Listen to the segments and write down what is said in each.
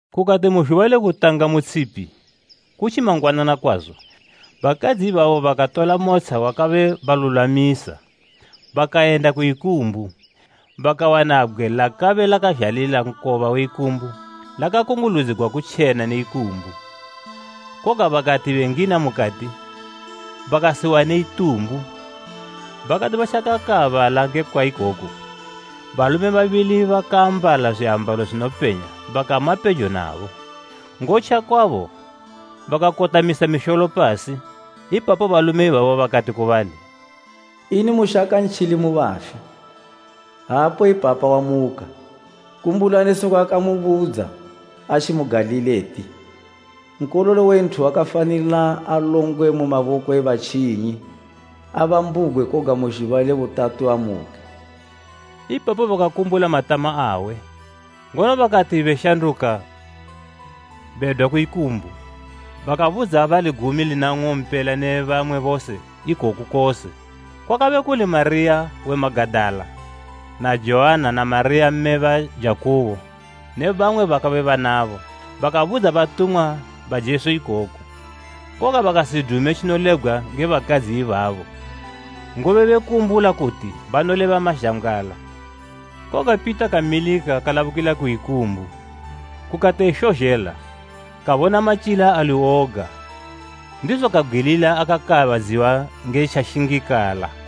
Kukati mu zhuba le kutanga mu tshipi, kutji mangwanana kwazo, bakadzi ibabo bakatola motsha wabakabe balulwamisa, bakayenda ku ikumbu. Bakawana bgwe lakabe lakazhalila nkoba we ikumbu lakakunguludzigwa kutjena ne ikumbu, koga bakati bengina mukati, bakasiwane itumbu. Bakati batjakakaabala ngekwa ikoku, balume babili bakaambala zwiambalo zwinopenya bakama pejo nabo. Ngotja kwabo, bakakotamisa misholo pasi, ipapo balume ibabo bakati ku bali, “Ini mushaka ntjili mu bafi? Aapo ipapa wamuka. Kumbulani sekwa akamubudza, atji mu Galili eti, ‘Nkololo we Nthu wakafanila alongwe mu maboko e batjinyi, abambugwe, koga mu zhuba le butatu amuke.’” Ipapo bakakumbula matama awe. Ngono bakati beshanduka bedwa ku ikumbu, bakabudza bali gumi lina ung'ompela ne bamwe bose ikoku kose. Kwakabe kuli Mariya we Magadala na Joanna na Mariya mme ba Jakubo ne bamwe bakabe banabo, bakabudza batumwa ba Jesu ikoku. Koga bakasidume tjinolebgwa nge bakadzi ibabo, ngobe bekumbula kuti banoleba mazhambgwala. Koga Pita kamilika kalabukila ku ikumbu, kukati eshozhela, kabona matyila ali woga, ndizo kabgwilila akakaabadziwa nge tjashingikala.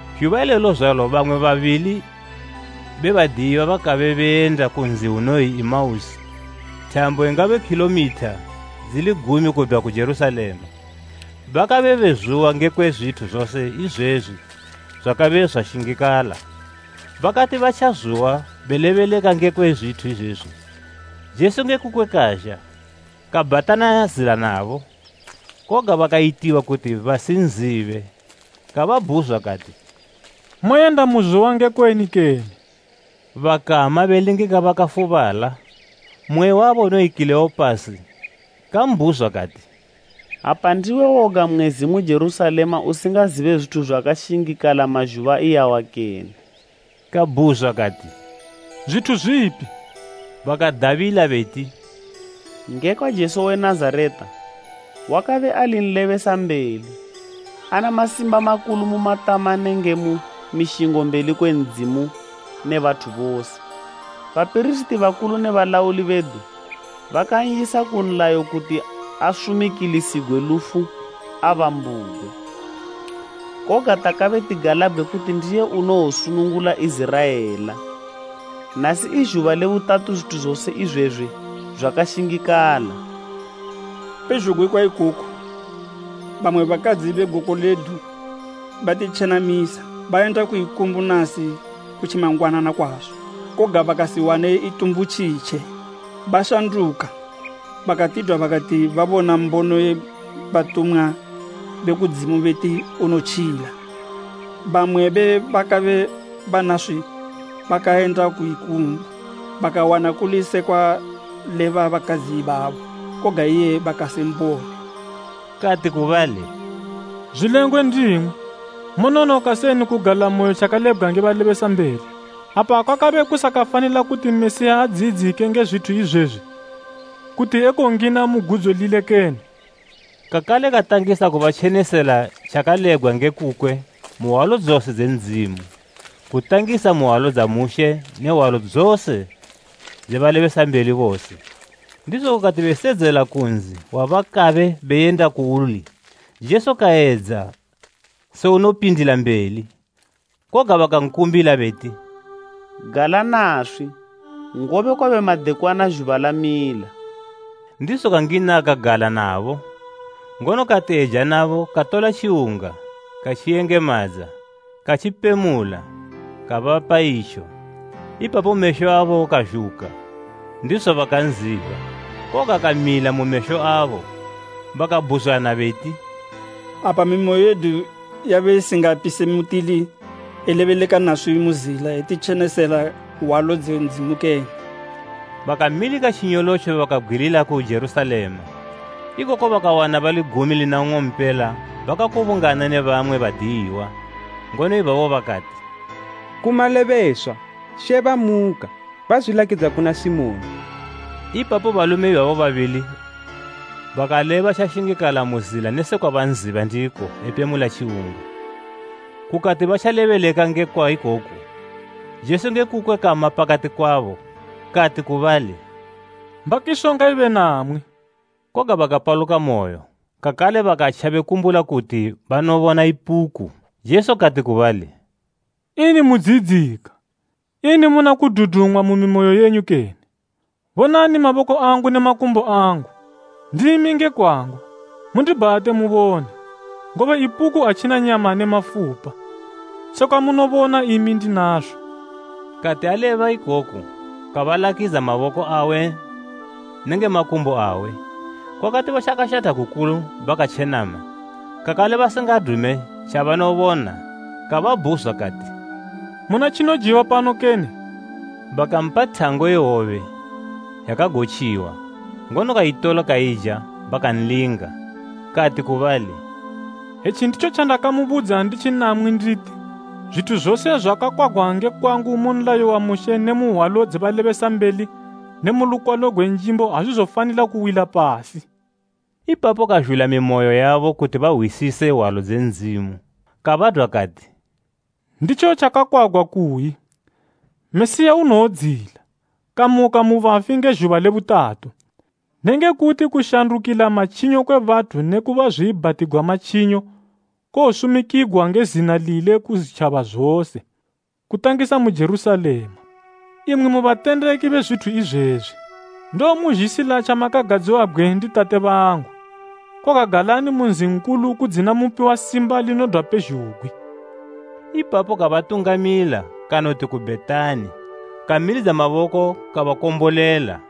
Zhuba ilelo zwalo bamwe babili be badiyiwa bakabe beyenda ku nzi unoyi Emausi, thambo ingabe khilomitha dzili gumi kudwa ku Jerusalema. Bakabe bezuwa ngekwe zwithu zose izwezwi zwakabe zwashingikala. Bakati batjazuwa belebeleka ngekwe zwithu izwezwi, Jesu nge kukwe kazha, kabhatana zila nabo. Koga bakayitiwa kuti basinzibe. Kababhuzwa kati, “Moyenda muzuwa ngekweni kene?” Bakama belingika bakafubala. Mmwe wabo unoyi Kileopasi kambhuzwa kati, “Apa ndiwe woga mwezi mu Jerusalema usingazibe zwithu zwakashingikala mazhuba iyawa kene?” Kabhuzwa kati, “Zwithu zwipi?” Bakadabila beti, “Ngekwa Jesu we Nazareta. Wakabe ali nlebesambeli, ana masimba makulu mu matama nenge mu mishingo mbeli kwe Ndzimu ne bathu bose. Bapirisiti bakulu ne balauli bedu bakan'yisa ku nlayo kuti asumikilisigwe lufu abambugwe. Koga takabe tigalabgwe kuti ndiye unowosunungula Iziraela. Nasi i zhuba le butatu zwithu zose izwezwi zwakashingikala. Pezhugwi kwa ikoku, bamwe bakadzi be goko ledu batitjenamisa. Bayenda ku ikumbu nasi kutji mangwanana kwazo, koga bakasiwane itumbu tjitje. Bashanduka bakatidwa bakati babona mbono ye batumwa be kudzimu beti, unotjila. Bamwe be bakabe banaswi bakayenda ku ikumbu, bakawana kuli se kwaleba bakadzi ibabo, koga iye bakasimbone.” Kati ku bali, “zwilengwe ndimwi, mononoka seni kugalamoyo tjakalebgwa nge balebesambeli! Apa kwakabe kusakafanila kuti Mesiya adziyidzike nge zwithu izwezwi, kuti ekongina mu gudzo lile kene?” Kakale katangisa kubatjenesela tjakalebgwa nge kukwe mu hwalo dzose dze Ndzimu, kutangisa mu hwalo dza Mushe ne hwalo dzose dze balebesambeli bose. Ndizo kukati besedzela ku nzi wabakabe beyenda kuuli Jesu kayedza se unopindila mbeli. Koga bakankumbila beti, “Gala naswi, ngobe kwabe madekwana zhuba lamila.” Ndizo kangina kagala nabo. Ngono kati eja nabo katola tjiwunga, katjiyengemadza, katjipemula, kabapa itjo. Ipapo mesho abo kazhuka, ndizo bakanziba, koga kamila mu mesho abo. Bakabhuzwana beti, “Apa mimoyo yedu yabe isingapise mutili elebeleka naswi mu zila etitjenesela hwalo dze Ndzimu kene?” Bakamilika tjinyolotjo bakabgwilila ku Jerusalema. Ikoko bakawana bali gumi lina ng'ompela bakakubungana ne bamwe badiyiwa ngono ibabo bakati, “Ku malebeswa! She bamuka, bazwilakidza kuna Simoni.” Ipapo balume ibabo babili bakaleba tjashingikala mu zila ne sekwa banziba ndiko epemula tjiwunga. Kukati batjalebeleka ngekwa ikoku, Jesu nge kukwe kama pakati kwabo, kati ku bali, “Mbakiso ngaibe namwi.” Koga Bakapaluka moyo, kakale bakatja bekumbula kuti banobona ipuku. Jesu kati ku bali, “Ini mudziyidzika? Ini muna kududumwa mu mimoyo yenyu kene? Bonani maboko angu ne makumbo angu. Ndimi nge kwangu! Mundibhate mubone, ngobe ipuku atjina nyama ne mafupa, sekwa munobona imi ndinazo.” Kati aleba ikoku kabalakidza maboko awe nenge makumbo awe. Kwakati batjakashatha kukulu bakatjenama, kakale basingadume tjabanobona kababhuzwa kati, “Muna tjinojiwa pano kene?” Bakampa thango ye hwobe yakagotjiwa, ngono kaitola kaija bakanlinga. Kati ku bali, “Etji nditjo tjandakamubudza nditji namwi nditi, zwithu zose zwakakwagwa nge kwangu mu nlayo wa Mushe ne mu hwalo dze balebesambeli ne mu lukwalo gwe Njimbo azwizofanila kuwila pasi.” Ipapo kazhula mimoyo yabo kuti bahwisise hwalo dze Ndzimu. Kabadwa kati, “Nditjo tjakakwagwa kuyi, Mesiya unowodziyila, kamuka mu bafi nge zhuba le butatu, nenge kuti kushandukila matjinyo kwe bathu neku bazwiibhatigwa matjinyo, kowosumikigwa nge zina lile ku zwitjaba zose, kutangisa mu Jerusalema. Imwi mu batendeki be zwithu izwezwi. Ndowomuzhisila tjamakagadziwabgwe ndi Tate bangu, koga galani mu nzi nkulu kudzina mupiwa simba linodwa pezhugwi.” Ipapo kabatungamila kanoti ku Bhetani, kamilidza maboko kabakombolela.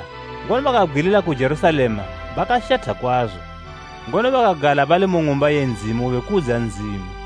Ipapo bakan'namata ngono bakabgwilila ku Jerusalema bakashatha kwazo. Ngono bakagala bali mu Ng'umba ye Ndzimu bekudza Ndzimu.